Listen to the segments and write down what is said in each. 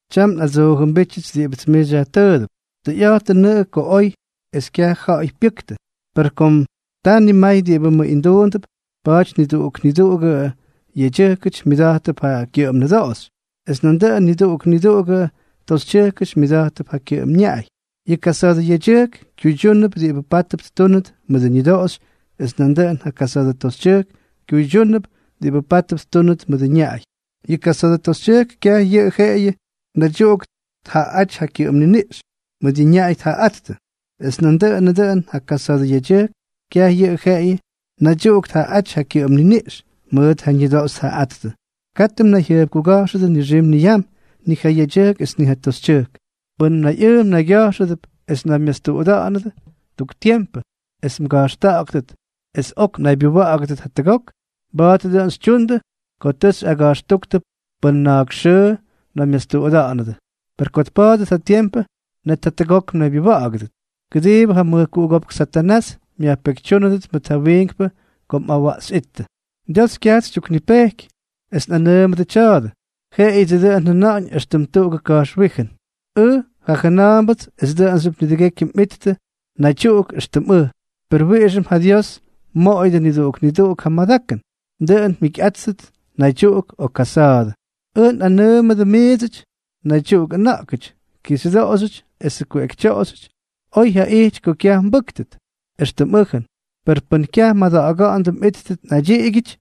Tyam nꞌadsoojʉmbítyʉts diꞌibʉts miits xyajtʉʉdʉp. Tʉyꞌa̱jtʉnʉꞌʉ ko oy es kyaj ja̱ꞌa̱y pyʉktʉ. Per kom ta nimay diꞌibʉ mʉꞌinduundʉp, pa̱a̱ty niduꞌuk niduꞌugʉ yedyʉjkʉty myʉdátʉp ja kyʉꞌʉm nʉdoꞌoxy, es nandʉꞌʉn niduꞌuk niduꞌugʉ toxytyʉjkʉty myʉdátʉp ja kyʉꞌʉm ñaꞌay. Yʉ kasa̱a̱dʉ yedyʉjk kyuydyúnʉp diꞌibʉ pátʉp ttúnʉt mʉdʉ ñʉdoꞌoxy es nandʉꞌʉn ja kasa̱a̱dʉ toxytyʉjk kyuydyúnʉp diꞌibʉ pátʉp ttúnʉt mʉdʉ ñaꞌay. Yʉ kasa̱a̱dʉ toxytyʉjk kyaj yʉꞌʉ jeꞌeyʉ natyuꞌuk tjaꞌaꞌáty ja kyʉꞌʉm niniꞌx, mʉʉt ja ñaꞌay tjaꞌaꞌáttʉ. Es nandʉꞌʉnʉ dʉꞌʉn ja kasa̱a̱dʉ yedyʉjk kyaj yʉꞌʉ jeꞌeyʉ natyuꞌuk tjaꞌaꞌáty ja kyʉꞌʉm niniꞌx, mʉʉt ja ñʉdoꞌoxy tjaꞌaꞌáttʉ. Katʉ mnayjyʉjpkuga̱jxʉdʉ nixim niyam, ni ja yedyʉjk es ni ja toxytyʉjk. Pʉn mnayꞌʉʉ mnaygya̱jxʉdʉp es mnaymyastuꞌuda̱ꞌa̱nʉdʉ tuk tiempʉ es mga̱jxta̱ꞌa̱ktʉt es ok mnaybyuwa̱ꞌa̱gʉdʉt jatʉgok, mba̱a̱t dʉꞌʉn xytyundʉ ko tʉ xyꞌaga̱jxtúktʉ pʉn na̱a̱k xʉʉ mnaymyastuꞌuda̱ꞌa̱nʉdʉ. Per ko tpa̱a̱dʉt ja tiempʉ, net jatʉgok mnaybyuwa̱ꞌa̱gʉdʉt, kʉdiibʉ ja mʉjkuꞌugópk Satanás myajpekytyúnʉdʉt mʉt ja wiinkpʉ ko mꞌawaꞌxyꞌíttʉ. Dios kyajts xytyuknipejky es nꞌanʉʉmʉdʉ tya̱a̱dʉ, jeꞌeyʉdsʉ dʉꞌʉn njʉna̱ꞌa̱ñ éxtʉm tuꞌugʉ nga̱jxwíjʉnʉts. Ʉj jajʉna̱a̱mbʉts es dʉꞌʉnxyʉp nidʉgekyʉ mjikyꞌattʉ naydyuꞌuk éxtʉm ʉj. Per wiꞌixʉm ja Dios mmoꞌoyʉdʉ niduꞌuk niduꞌuk ja madakʉn, dʉꞌʉn mjikyꞌáttʉt naydyuꞌuk o kasa̱a̱dʉ. Ʉj nꞌanʉʉmʉdʉ miidsʉty naydyuꞌuk ʉna̱ꞌkʉty, kixyʉdoꞌoxyʉty esʉ kuꞌekytyoꞌoxyʉty, oy jaꞌijty ko kyaj mbʉktʉ, éxtʉm ʉjʉn. Per pʉn kyaj mmada̱ꞌa̱ga̱ꞌa̱ndʉ mꞌíttʉt naydyiꞌigyʉty,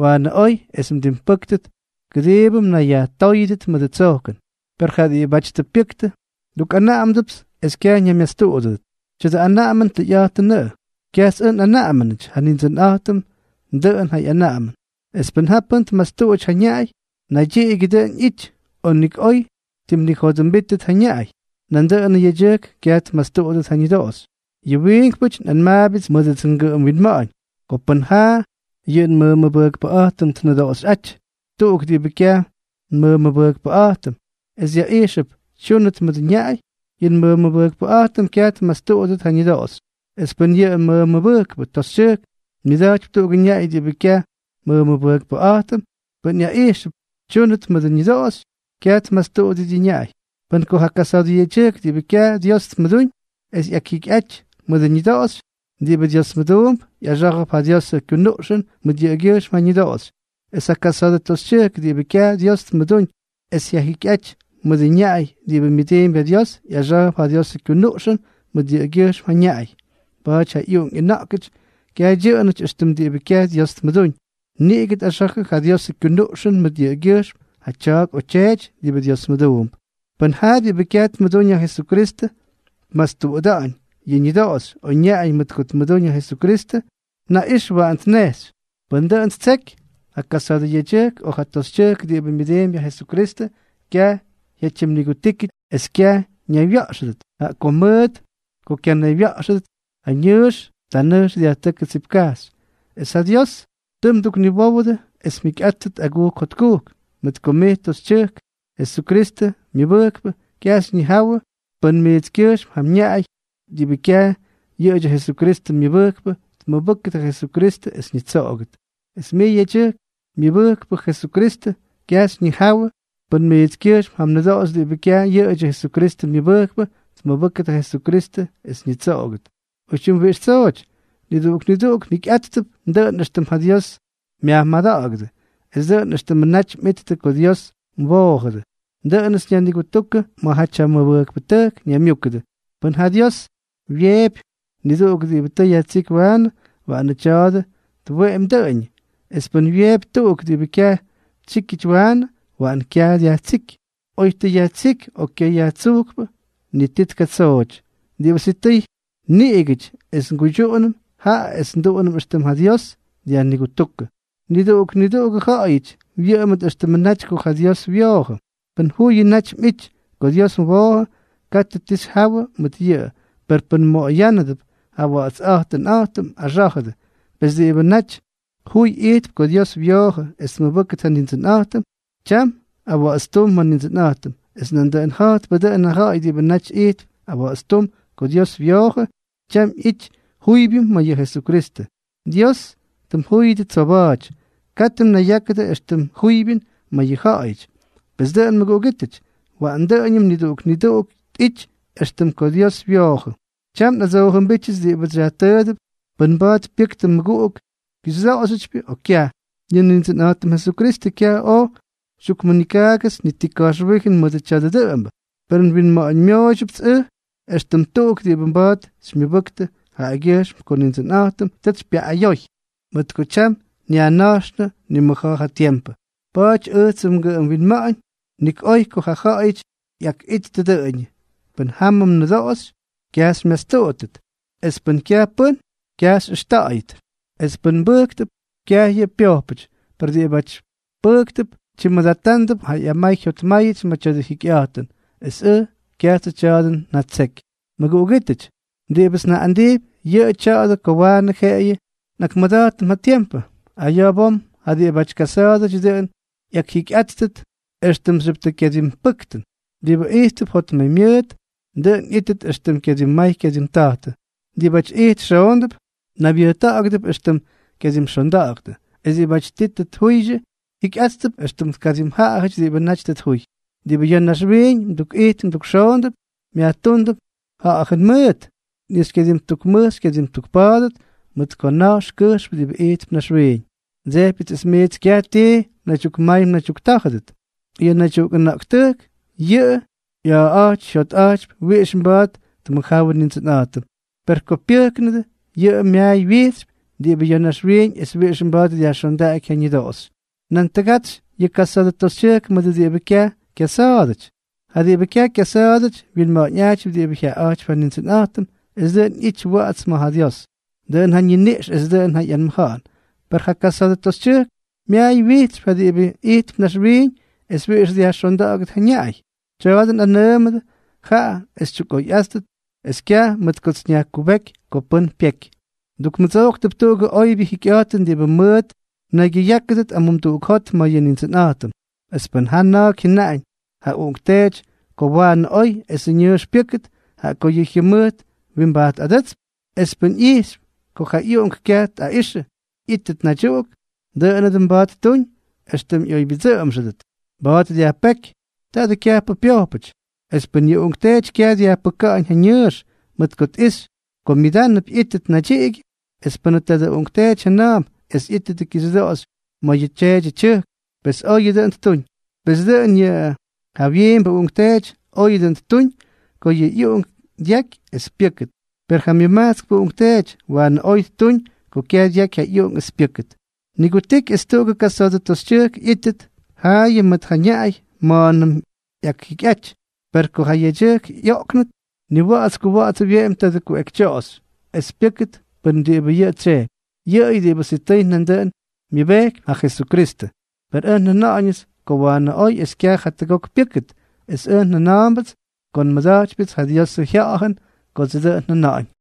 waanʉ oy es mdimpʉ́ktʉt, kʉdiibʉ mnayyajtóyʉdʉt mʉdʉ tsojkʉn. Per ja diꞌibáty tʉ pyʉktʉ, ndukꞌanaꞌamdʉpts es kyaj ñaymyastuꞌudʉdʉt. Tya̱dʉ anaꞌamʉn tʉyꞌa̱jtʉnʉꞌʉ. Kyajts ʉj nꞌanaꞌamʉnʉty, ja Nindsʉnꞌa̱jtʉm dʉꞌʉn ja ꞌyanaꞌamʉn. Es pʉn ja pʉ́n tmastuꞌuty ja ñaꞌay, naydyiꞌigyʉ dʉꞌʉn ꞌyítʉty, o nik oy ttimnijodʉmbítʉt ja ñaꞌay. Nandʉꞌʉnʉ yedyʉjkʉty kyaj tmastuꞌudʉt ja ñʉdoꞌoxy. Yʉ wiinkpʉty nꞌanmaabyʉts mʉdʉdsʉ ngʉꞌʉm winma̱ꞌa̱ñ. Ko pʉn jaa yʉ nmʉmʉbʉjkpʉꞌa̱jtʉm tnʉdoꞌoxyꞌáty tuꞌuk diꞌibʉ kyaj nmʉmʉbʉjkpʉꞌa̱jtʉm es ꞌyaꞌijxʉp tsyʉʉnʉt mʉdʉ ñaꞌay, yʉ nmʉmʉbʉjkpʉꞌa̱jtʉm kyaj tmastuꞌudʉt ja ñʉdoꞌoxy. Es pʉn yʉ nmʉmʉbʉjkpʉ toxytyʉjk myʉda̱jtypy tuꞌugʉ ñaꞌay diꞌibʉ kyaj nmʉmʉbʉjkpʉꞌa̱jtʉm, pʉn ꞌyaꞌijxʉp tsyʉʉnʉt mʉdʉ ñʉdoꞌoxy, kyaj tmastuꞌudʉt ja ñaꞌay. Mʉt ko ja kasa̱a̱dʉ yedyʉjk diꞌibʉ kyaj Dios tmʉdúñ es ꞌyakjikyꞌaty mʉdʉ ñʉdoꞌoxy diꞌibʉ Diosmʉduump, ꞌyaxá̱jʉp ja Diosʉ kyunuꞌxʉn mʉt yʉꞌʉgyʉjxm ja ñʉdoꞌoxy. Es ja kasa̱a̱dʉ toxytyʉjk diꞌibʉ kyaj Dios tmʉdúñ es ꞌyakjikyꞌaty mʉdʉ ñaꞌay diꞌibʉ myʉdiimpy ja Dios, ꞌyaxá̱jʉp ja Diosʉ kyunuꞌxʉn mʉt yʉꞌʉgyʉjxm ja ñaꞌay. Pa̱a̱ty ja ꞌyuꞌunk ꞌyʉna̱ꞌkʉty kyaj dyʉꞌʉnʉty éxtʉmʉ diꞌibʉ kyaj Dios tmʉdúñ. Niꞌigʉ tꞌaxa̱jʉ ja Diosʉ kyunuꞌxʉn mʉt yʉꞌʉgyʉjxm ja tya̱a̱k o tyeety diꞌibʉ Diosmʉduump. Pʉn ja diꞌibʉ kyaj tmʉdúñ ja Jesukristʉ tmastuꞌuda̱ꞌa̱ñ ja ñʉdoꞌoxy o ñaꞌay mʉt ko tmʉdúñ ja Jesukristʉ, naꞌix waꞌan tnejxy. Pʉn dʉꞌʉn ttseky, ja kasa̱a̱dʉ yedyʉjk o ja toxytyʉjk diꞌibʉ myʉdiimpy ja Jesukristʉ, kyaj jyatyimnigutíkyʉty es kyaj ñaywya̱ꞌxʉdʉt, jaꞌa ko mʉt ko kyanaywya̱ꞌxʉdʉt, ta nʉjx dyajtʉ́kʉdʉ tsipkajxy. Es ja Dios tʉ mdukniwówʉdʉ es mjikyꞌáttʉt agujk jotkujk. Mʉt ko mij toxytyʉjk, Jesukristʉ myʉbʉjkpʉ, kyaj xyñijawʉ pʉn mijtskyʉjxm ja mñaꞌay diꞌibʉ kyaj yʉꞌʉdyʉ Jesukristʉ myʉbʉjkpʉ tmʉbʉ́kʉt ja Jesukristʉ es ñitsoꞌogʉt. Es mij yedyʉjk, myʉbʉjkpʉ Jesukristʉ, kyaj xyñijawʉ pʉn mijtskyʉjxm ja mnʉdoꞌoxy diꞌibʉ kyaj yʉꞌʉdyʉ Jesukristʉ myʉbʉjkpʉ tmʉbʉ́kʉt ja Jesukristʉ es ñitsoꞌogʉt. Oytyim wiꞌix tsooty, niduꞌuk niduꞌuk mjikyꞌáttʉp dʉꞌʉn éxtʉm ja Dios myajmada̱ꞌa̱gʉdʉ, es dʉꞌʉn éxtʉmʉ naty mꞌittʉ ko ja Dios mwoojʉdʉ. Dʉꞌʉnʉts nyajnigutúkʉ ma̱jaty ja mʉbʉjkpʉtʉjk ñaymyúkʉdʉ. Pʉn ja Dios wyeepy niduꞌuk diꞌibʉ tʉ yajtsíky waanʉ, waꞌanʉ tya̱a̱dʉ tweꞌemy dʉꞌʉñʉ. Es pʉn wyeepy tuꞌuk diꞌibʉ kyaj tsyíkyʉty waanʉ, waꞌan kyaj dyajtsíky. Oy tʉ yajtsíky o kyayajtsujkpʉ, ni ti tkatsooty. Diꞌibʉ sitʉy nigutiky es nguydyuꞌunʉm, jaꞌa es nduꞌunʉm éxtʉm ja Dios dyajnigutúkʉ. Niduꞌuk niduꞌugʉ ja̱ꞌa̱yʉty wyʉꞌʉmʉt éxtʉmʉ naty ko ja Dios wyoojʉ. Pʉn juyʉ naty mꞌity ko Dios mwoojʉ, katʉ ti xyjawʉ mʉt yʉꞌʉ. Per pʉn mmoꞌoyánʉdʉp ja mꞌawa̱ꞌa̱tstumꞌa̱jtʉn, axá̱jʉdʉ. Pes diꞌibʉ naty juy ijtp ko Dios wyoojʉ es tmʉbʉ́kʉt ja Nindsʉnꞌa̱jtʉm, tyam awa̱ꞌa̱tstúm ma̱ Nindsʉnꞌa̱jtʉm; es nandʉꞌʉn ja̱jtpʉ dʉꞌʉn ja ja̱ꞌa̱y diꞌibʉ naty ijtp awa̱ꞌa̱tstúm ko Dios wyoojʉ, tyam ꞌyity juybyʉn ma̱ yʉ Jesukristʉ. Dios tʉ mjúyʉdʉ tsoba̱a̱ty. Katʉ mnayyákʉdʉ éxtʉm juybyʉn ma̱ yʉ ja̱ꞌa̱yʉty. Pes dʉꞌʉn, mʉguꞌugítʉty, waꞌan dʉꞌʉñʉm niduꞌuk niduꞌuk tꞌity éxtʉm ko ja Dios wyoojʉ. Tyam nꞌadsoojʉmbítyʉts diꞌibʉts xyajtʉʉdʉp pʉn mba̱a̱t pyʉktʉ mꞌuꞌungʉ kixyʉdoꞌoxyʉtypyʉ, o kyaj. Yʉ Nindsʉnꞌa̱jtʉm Jesukristʉ kyaj oj xytyukmʉnikaagʉts ni ti ka̱jxwíjʉn mʉdʉ tya̱a̱dʉ dʉꞌʉmbʉ; per nwinma̱ꞌa̱ñmyooydyʉpts ʉj, éxtʉm tuꞌuk diꞌibʉ mba̱a̱t xymyʉbʉktʉ jaꞌagyʉjxm ko Nindsʉnꞌa̱jtʉm tʉts xypyaꞌꞌayoy. Mʉt ko tyam nyajna̱jxʉnʉ nimʉja̱a̱ ja tiempʉ, pa̱a̱ty ʉjtsʉmʉ ngʉꞌʉm winma̱ꞌa̱ñ nik oy ko ja ja̱ꞌa̱yʉty ꞌyakꞌittʉ dʉꞌʉñʉ. Pʉn jamʉ mnʉdoꞌoxy, kyaj xymyastuꞌudʉt; es pʉn kyaj pʉ́n, kyaj xyꞌʉxta̱ꞌa̱yʉt. Es pʉn mbʉjktʉp, kyaj yʉꞌʉ pyojpʉty. Per diꞌibáty pʉjktʉp, tyimmʉdatándʉp ja ꞌyamay jyotmáyʉty ma̱ tya̱dʉ jikyꞌa̱jtʉn, es ʉj kyajtsʉ tya̱a̱dʉ njatseky. Mʉguꞌugítʉty, diꞌibʉts njaꞌꞌandijpy, yʉꞌʉ tya̱a̱dʉ ko waanʉ jeꞌeyʉ nꞌakmʉda̱jtʉm ja tiempʉ. Aya̱ bom ja diꞌibáty kasa̱a̱dʉty dʉꞌʉn ꞌyakjikyꞌáttʉt éxtʉmxyʉp tʉ kyadimpʉktʉ. Diꞌibʉ ijttʉp jotmaymyʉʉt, dʉꞌʉn ꞌyꞌítʉt éxtʉm kyadimmay kyadimta̱jtʉ. Diꞌibáty ijt xoondʉp, naybyʉjta̱ꞌa̱gʉdʉp éxtʉm kyadimxonda̱ꞌa̱ktʉ. Es diꞌibáty ti tʉ tjuydyʉ, jikyꞌáttʉp éxtʉm tkadimjaꞌajʉty diꞌibʉ naty tʉ tjuy. Diꞌibʉ ya̱ naxwiiñ mdukꞌijt mdukxoondʉp, myajtúndʉp ja̱ꞌa̱jʉn mʉʉt, ni xykyadimtukmʉj xykyadimtukpa̱a̱dʉt, mʉt ko na̱jx kʉjxp diꞌibʉ ijtp naxwiiñ. Ndsejpyʉts es miits kyaj ti mnaydyukmay mnaydyuktá̱jʉdʉt. Yʉ naydyuꞌuk ʉna̱ꞌktʉjk yʉꞌʉ ꞌya̱a̱ꞌa̱jty jyotꞌa̱jtypy wiꞌix mba̱a̱t tmʉjjáwʉ Nindsʉnꞌa̱jtʉm. Per ko pyʉjknʉdʉ, yʉꞌʉ myaay wyijtsypy diꞌibʉ ya̱ naxwiiñ es wiꞌix mba̱a̱t dyajxondaꞌaky ja ñʉdoꞌoxy. Nan tʉgatsyʉꞌʉ yʉ kasa̱a̱dʉ toxytyʉjk mʉdʉ diꞌibʉ kyaj kyasa̱a̱dʉty. Ja diꞌibʉ kyaj kyasa̱a̱dʉty wyinma̱ꞌa̱ñꞌajtypy diꞌibʉ jyaꞌaꞌa̱jtypy ja Nindsʉnꞌa̱jtʉm es dʉꞌʉn ꞌyítʉt wa̱ꞌa̱ts ma̱ Dios, dʉꞌʉn ja ñiniꞌx es dʉꞌʉn ja ꞌyanmʉja̱ꞌa̱n. Per ja kasa̱a̱dʉ toxytyʉjk myaay wyijtsypy ja diꞌibʉ ijtp naxwiiñ es wiꞌix dyajxonda̱ꞌa̱gʉt ja ñaꞌay. Tya̱a̱dʉ nꞌanʉʉmʉdʉ jaꞌa es xytyukꞌoyꞌáttʉt es kyaj mʉt kots nyajkubéky ko pʉ́n pyeky. Ndukmʉdsojktʉp tuꞌugʉ oybyʉ jikyꞌa̱jtʉn diꞌibʉ mʉʉt mnaygyʉyákʉdʉt amumduꞌuk ma̱ yʉ Nindsʉnꞌa̱jtʉm. Es pʉn jaa na̱a̱k jyʉnaꞌañ ja uꞌunkteety ko waanʉ oy esʉ ñʉʉx pyʉ́kʉt, jaꞌa ko yʉ jyʉmʉjt wimbajtꞌadʉ́tsp, es pʉn ꞌyijxypy ko ja ꞌyuꞌunk kyaj tꞌaꞌixʉ ꞌyítʉt naydyuꞌuk, dʉꞌʉnʉ dʉn mba̱a̱t ttuñ éxtʉm ꞌyoybyʉdsʉꞌʉmxʉdʉt. Mba̱a̱t dyajpéky. Taadʉ kyajpʉ pyojpʉty. Es pʉn yʉ uꞌunkteety kyaj dyajpʉka̱ꞌa̱ñ ja ñʉʉx, mʉt ko tꞌixy ko myʉdánʉp ꞌyítʉt naydyiꞌigyʉ, es pʉnʉ tadʉ uꞌunkteety jʉna̱a̱mp es ꞌyítʉt kixyʉdoꞌoxy ma̱ yʉ tyeedyʉ tyʉjk, pes oyʉ dʉꞌʉn ttuñ. Pes dʉꞌʉn yʉ jawyiimbʉ uꞌunkteety oyʉ dʉꞌʉn ttuñ ko yʉ ꞌyuꞌunk dyaky es pyʉ́kʉt, per ja myʉmajtskpʉ uꞌunkteety waanʉ oy ttuñ ko kyaj dyaky ja ꞌyuꞌunk es pyʉ́kʉt. Nigutiky es tuꞌugʉ kasa̱a̱dʉ toxytyʉjk ꞌyítʉt yʉꞌʉyʉ mʉt ja ñaꞌay ma̱a̱nʉm ꞌyakjikyꞌaty; per ko ja yedyʉjk ꞌyoꞌknʉt, niwa̱ꞌa̱ts kuwa̱ꞌa̱ts wyeꞌemy tadʉ kuꞌekytyoꞌoxy es pyʉ́kʉt mʉt diꞌibʉ yʉꞌʉ tsyejpy, yʉꞌʉyʉ diꞌibʉ sitʉy nandʉꞌʉn myʉbejkypy ja Jesukristʉ. Per ʉj njajʉna̱ꞌa̱ñʉts ko waanʉ oy es kyaj jatʉgok pyʉ́kʉt, es ʉj jʉna̱a̱mbʉts ko nmʉda̱jtypyʉts ja Diosʉ Jya̱ꞌa̱jʉn kodsʉ dʉꞌʉn njʉna̱ꞌa̱ñ.